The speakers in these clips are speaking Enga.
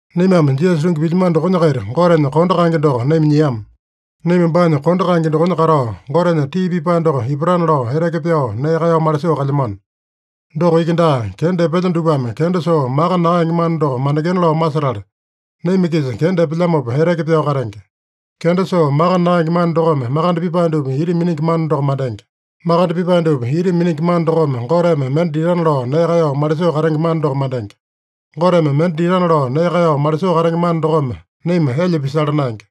Naimame Jisasa tungi pilyamano dokonya-kaita Gotenya kondo kaenge doko naima nyiama. Naima baanya kondo kaenge dokonya katao, Gotenya tii pipae doko ipatana lao eteke pyao, nee kaeyao malisoo kalyamano. Doko iki daa, kenda epelya dupame kenda soo maka nakaenge mana doko mandengena lao masetala, naima-kisa kenda epelyamopa eteke pyao katenge. Kenda soo maka nakaenge mana dokome makande pipae dupa ita miningi mana doko mandenge. Makande pipae dupa ita miningi mana dokome Goteme mende ditana lao nee kaeyao malisoo katenge mana doko mandenge. Goteme mende ditana lao nee kaeyao malisoo katenge mana dokome naima elya pisala naenge.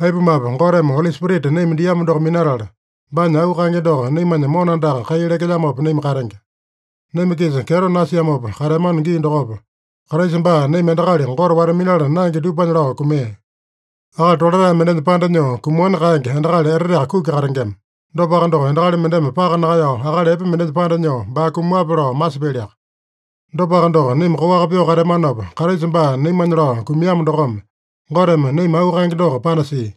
Aipumape, Goteme Oli Spirita naima diamo doko minatala, baanya auu kaenge doko naimanya mona andaka kai lekelyamopa naima katenge. Naima-kisa kyeto nasiamopa kateamano gii dokopa, Kraisa baa naima endakali Gote wata-minala naenge dupanya lao kumia. Akali tolatae mendenya panda nyoo kumaowani kaenge endakali eteteaka kuki katengema. Dopaka doko, endakali mendeme paka nakaeyao akali epe mendenya panda nyoo baa kumaowape lao masipyaliaka. Dopaka doko, naima koaka pyoo kateamanopa, Kraisa baa naimanya lao kumiamo dokome, Goteme naima auu kaenge doko panasia.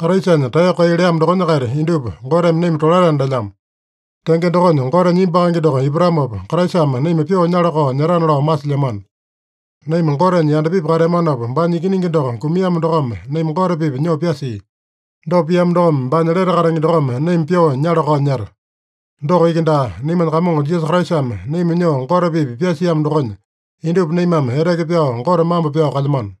Kraisanya taeyoko kai leamo dokonya-kaita indupa Goteme naima tolataena lelyamo. Tenge dokonya, Gotenya imbu kaenge doko ipatamopa, Kraisame naima pyoo nyala-kao nyetana lao masilyamano. Naima Gotenya yandapipi kateamanopa, baanya Ikiningi doko kumiamo dokome naima Gote-pipa nyoo pyasia. Dopa piamo dokome, baanya lete katenge dokome naima pyoo nyala-kao nyeta. Doko iki daa, naimanya Kamongo Jisasa Kraisame naima nyoo Gote-pipa pyasiamo dokonya, indupa naimame eteke pyao Gote mambo pyao kalyamano.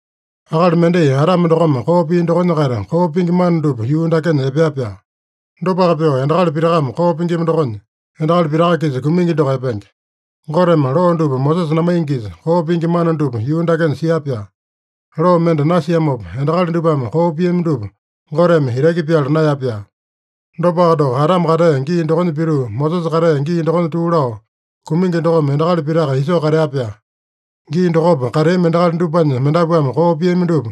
Akali mendai Adame dokome koo pia dokonya-kaita koo pingi mana dupa yuu dakenya epea-pyaa. Dopaka pyoo, endakali pitakame koo pingima dokonya, endakali pitaka-kisa kumingi doko epenge. Goteme loo dupa Mosesa namaingisa, koo pingi mana dupa yuu dakenya sia-pyaa. Loo mende nasiamopa, endakali dupame koo piami dupa Goteme itaki pyala naeya-pyaa. Dopaka doko, Adame katea gii dokonya pituu, Mosesa katea gii dokonya tuu lao, kumingi dokome endakali pitaka isoo katea-pyaa. Gii dokopa kateami endakali dupanya mendapuame koo piami dupa,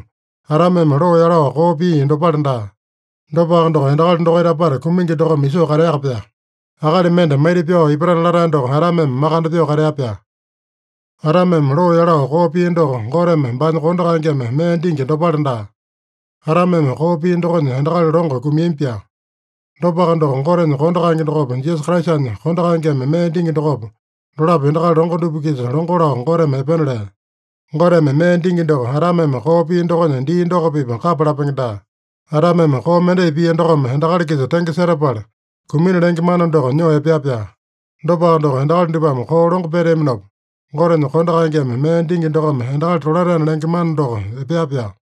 Adameme loo yalao koo pia dopale daa. Dopaka doko, endakali dokaita apata kumingi dokome isoo kateaka-pyaa. Akali mende maita-pyao ipatana latae doko Adameme makande pyoo katea-pyaa. Adameme loo yalao koo pia doko, Goteme baanya kondo kaengeme mee dingi dopale daa. Adameme koo pia dokonya endakali longo kumiami-pyaa. Dopaka doko, Gotenya kondo kaenge dokopa, Jisasa Kraisanya kondo kaengeme mee dingi dokopa, dolapo endakali longo dupa-kisa longo lao Goteme epena lea. Goteme mee dingi doko, Adameme koo pia dokonya dii doko-pipa kapa lapenge daa. Adameme koo mendai pia dokome endakali-kisa tenge setapala, kumina lenge mana doko nyoo epea-pyaa. Dopaka doko, endakali dupame koo longo peteaminopa, Gotenya kondo kaengeme mee dingi dokome endakali tolataena lenge mana doko epea-pyaa.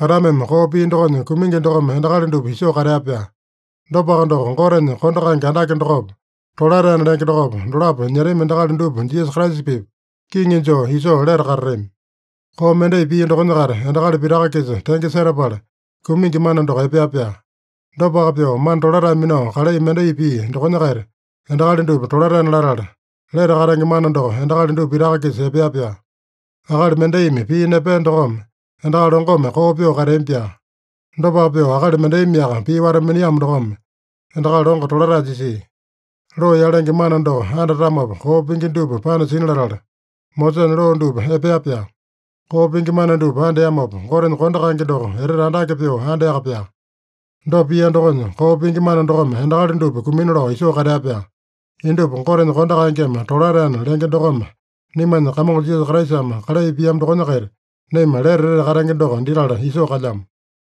Adameme koo pia dokonya, kumingi dokome endakali dupa isoo katea-pyaa. Dopaka doko, Gotenya kondo kaenge andake dokopa, tolataena lenge dokopa, dolapo nyetami endakali dupa Jisasa Kraisa-pipa kiŋi joo isoo lete katatami. Koo mendai pia dokonya-kaita endakali pitaka-kisa tenge setapala, kumingi mana doko epea-pyaa. Dopaka pyoo, mana tolatae minao kalai mendai pia dokonya-kaita, endakali dupa tolataena latala, lete katenge mana doko endakali dupa pitaka-kisa epea-pyaa. Akali mendaimi pii nepea dokome, endakali longome koo pyoo kateami-pyaa. Dopaka pyoo, akali mendaimiaka pii wata-miniamo dokome endakali longo tolatae jisia. Loo yalenge mana doko andatamopa koo pingi dupa panasina latala, Mosesanya loo dupa epea-pyaa. Koo pingi mana dupa andeamopa, Gotenya kondo kaenge doko etete andake pyoo andeaka-pyaa. Dopa pia dokonya, koo pingi mana dokome endakali dupa kumina lao isoo katea-pyaa. Indupa Gotenya kondo kaengeme tolataena lenge dokome, naimanya Kamongo Jisasa Kraisame kalai piamo dokonya-kaita, naima lete etete katenge doko ditala isoo kalyamo.